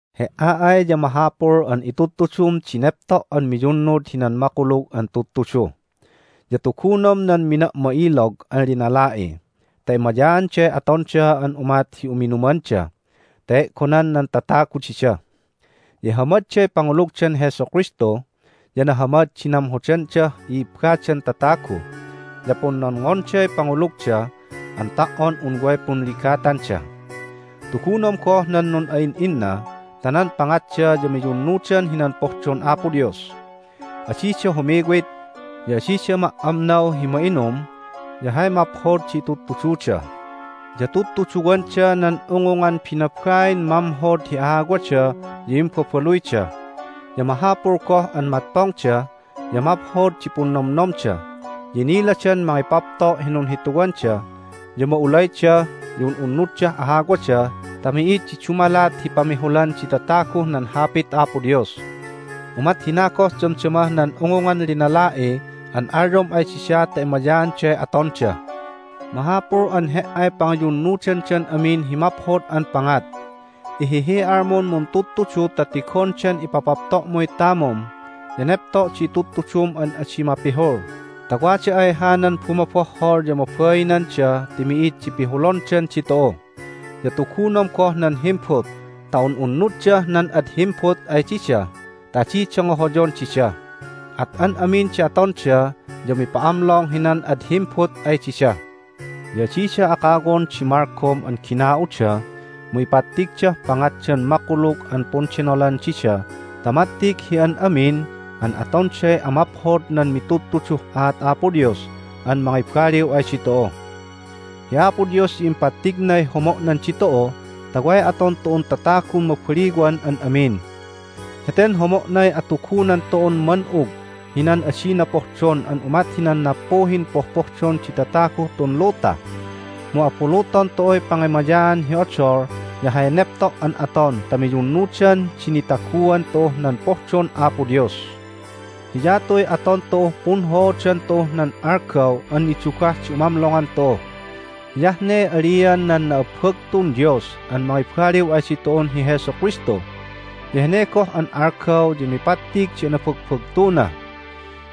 He"a ay ya mahapul an itudtudum di nepto' an miyunnud hinan Makulug an Tudtudu. Ya tugunom nan mina'ma'ilog an linala'i ta emayaanday atonda an umat hi uminumanda ta e'gonan nan tatagu dida, ya ihamadday pangulugdan Jesu Kristu, ya nahamad di namhoddah i'ibbadan tatagu, ya punnonngonday pangulugda an ta"on un way punligatanda. Tugunom goh nan nun'a'in'inna ta nan pangatda ya miyunnudan hinan pohdon Apo Dios. Adida humiwit, ya adida ma"amnaw hi ma'inum, ya hay maphod di itudtududa, ya tudtuduwanda nan ungungan binabain mamhod hi ahawada ya imbabaluyda, ya mahapul goh an matpongda, ya maphod di punnomnomda, ya iniladan mangipapto' hi nunhituwanda, ya ma'ulayda, ya un'unnuddah ahawada ta mi'id di dumalat hi pamihulan di tataguh nan Hapit Apo Dios. Umat hina goh damdamah nan ungungan linala'i an alyom ay dida ta emayaanday atonda. Mahapul an he"ay pangiyunnudandan amin hi maphod an pangat. Ihihi'almun muntudtudu ta tigondan ipapapto'muy tamum ya nepto' di itudtudum an adi mapihul ta wada ay hanan bumobohhol ya mabainanda ti mi'id di pihulondan ditu'u. Ya tugunom goh nan himbut ta un'unnuddah nan ad himbut ay dida ta adida ngohoyon dida, at an amin di atonda ya umipa'amlong hinan ad himbut ay dida. Ya adida akawon di malgom an gina'uda, mu ipattigdah pangatdan makulug an pundenolan dida ta mattig hi an amin an atonday amaphod nan mitudtuduh aat Apo Dios an mangibaliw ay ditu'u. Hi Apo Dios ya impattignay homo'nan ditu'u ta way aton tu'un tatagun mabaliwan an amin. Heten homo'nay atugunan tu'un man'ug hinan adina pohdon an umat hinan nappuhin pohpohdon di tataguh tun luta. Mu abuluton tu'uy pangemayaan hi odol ya hay nepto' an aton ta miyunnudan di nitaguan tu'uh nan pohdon Apo Dios. Hiyatuy aton tu'uh punhoodan tu'uh nan algaw an nidugah di umamlongan tu'u. Hiyah ne alian nan na'abbagtun Dios an mangibaliw ay ditu'un hi Jesu Kristu, ya hene goh an algaw ya mipattig di anabagbagtuna.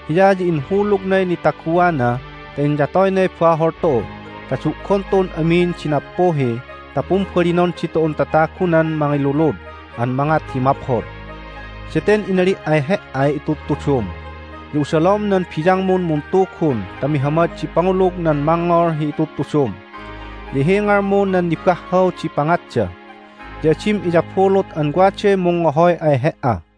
Hiya ya inhulugnay nitaguana ta inyatoynay bahol tu'u ta du'gon tu'un amin di nappuhi ta pumbalinon ditu'un tatagunan mangilulud an mangat hi maphod. Daten inali' ay he"ay itudtudum. Ya usalom nan biyangmun muntugun ta mihamad di pangulug nan mangngol hi itudtudum, ya ihingalmu nan nibahhaw di pangatda. Ya adim iyabulut an waday mungngohoy ay he"a.